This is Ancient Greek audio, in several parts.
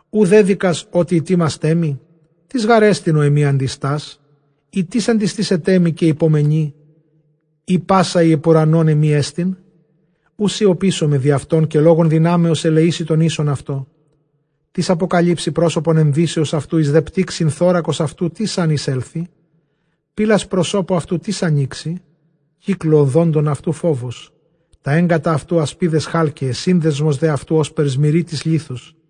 Οὐ δέδοικας, ὅτι ἡτοίμασταί μοι; τίς γάρ ἐστιν ὁ ἐμοὶ ἀντιστάς; Ἢ τίς ἀντιστήσεταί μοι, καὶ ὑπομενεῖ; εἰ πᾶσα ἡ ὑπʼ οὐρανὸν ἐμή ἐστιν, Οὐ σιωπήσομαι διʼ αὐτόν· καὶ λόγον δυνάμεως ἐλεήσει τὸν ἶσον αὐτῷ. Τίς ἀποκαλύψει πρόσωπον ἐνδύσεως αὐτοῦ, εἰς δὲ πτύξιν θώρακος αὐτοῦ τίς ἂν εἰσέλθοι; Πύλας προσώπου αὐτοῦ τίς ἀνοίξει; κύκλῳ ὀδόντων αὐτοῦ φόβος. Τὰ ἔγκατα αὐτοῦ ἀσπίδες χάλκεαι. σύνδεσμος δὲ αὐτοῦ, ὥσπερ σμυρίτης λίθος.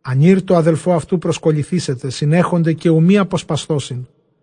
Ἀνὴρ τῷ ἀδελφῷ αὐτοῦ προσκολληθήσεται· συνέχονται καὶ οὐ μὴ ἀποσπασθῶσιν.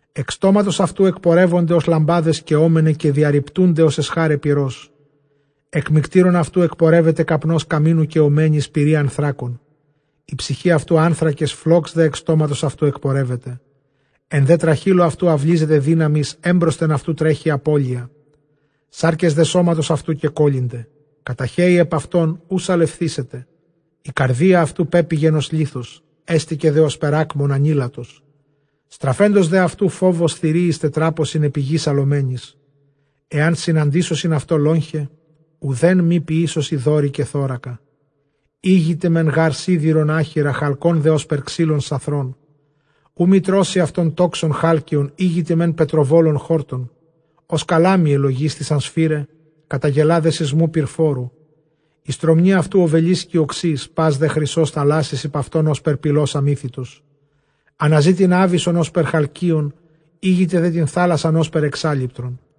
Ἐκ στόματος αὐτοῦ ἐκπορεύονται ὡς λαμπάδες καιόμεναι, καὶ διαῤῥιπτοῦνται ἑς ἐσχάραι πυρός. Ἐκ μυκτήρων αὐτοῦ ἐκπορεύεται καπνὸς καμίνου καιομένης πυρὶ ἀνθράκων. Ἡ ψυχὴ αὐτοῦ ἄνθρακες, φλὸξ δὲ ἐκ στόματος αὐτοῦ ἐκπορεύεται· Ἐν δὲ τραχήλῳ αὐτοῦ αὐλίζεται δύναμις, ἔμπροσθεν αὐτοῦ τρέχει ἀπώλεια. Σάρκες δὲ σώματος αὐτοῦ κεκόλληνται· καταχέει ἐπʼ αὐτὸν, οὐ σαλευθήσεται. Ἡ καρδία αὐτοῦ πέπηγεν ὡς λίθος, ἕστηκε δὲ ὥσπερ ἄκμων ἀνήλατος. Στραφέντος δὲ αὐτοῦ, φόβος θηρίοις τετράποσιν ἐπὶ γῆς ἁλλομένοις. Ἐὰν συναντήσωσιν αὐτῷ λόγχαι, οὐδὲν μὴ ποιήσωσι, δόρυ, καὶ θώρακα. Ἥγηται μὲν γὰρ σίδηρον ἄχυρα, χαλκὸν δὲ ὥσπερ ξύλον σαθρόν. Οὐ μὴ τρώσῃ αὐτὸν τόξον χάλκεον· ἥγηται μὲν πετροβόλον χόρτον. Ὡς καλάμη ἐλογίσθησαν σφυρά, καταγελᾷ δὲ σεισμοῦ πυρφόρου. Ἡ στρωμνὴ αὐτοῦ ὀβελίσκοι ὀξεῖς, πᾶς δὲ χρυσὸς θαλάσσης ὑπʼ αὐτὸν ὥσπερ πηλὸς ἀμύθητος. Ἀναζεῖ τὴν ἄβυσσον ὥσπερ χαλκεῖον· ἥγηται δὲ τὴν θάλασσαν ὥσπερ ἐξάλειπτρον,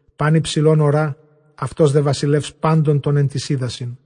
Πᾶν ὑψηλὸν ὁρᾷ· αὐτὸς δὲ βασιλεὺς πάντων τῶν ἐν τοῖς ὕδασιν.